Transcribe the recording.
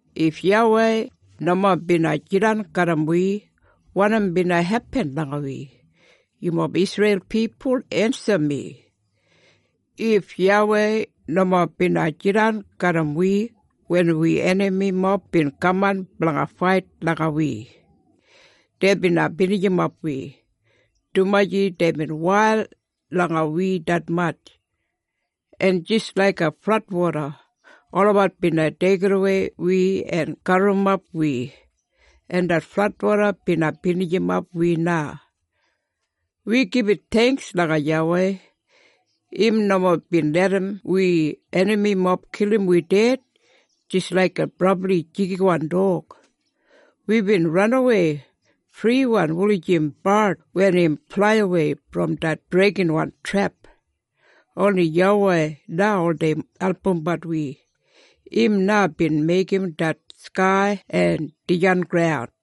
If YAWEI nomo bina jidan garram wi, wanim bina hepin langa wi? Yumob Isreil pipul ensim mi! “If YAWEI nomo bina jidan garram wi wen wi enamimob bin kaman blanga fait langa wi, dei bina binijimap wi, dumaji deibin wail langa wi detmatj, en jis laiga fladwoda, olabat bina deigimwei wi en gaburrumap wi, en det fladwoda bina binijimap wi na.” Wi gibit theingks langa YAWEI. Im nomo bin larram wi enamimob kilim wi ded, jis laiga brabli jigiwan dog. Wibin ranawei friwan wulijim bard wen im flaiwei brom det breikinwan trep. Oni YAWEI na oldei albumbat wi. Im na bin meigim det skai en dijan graun.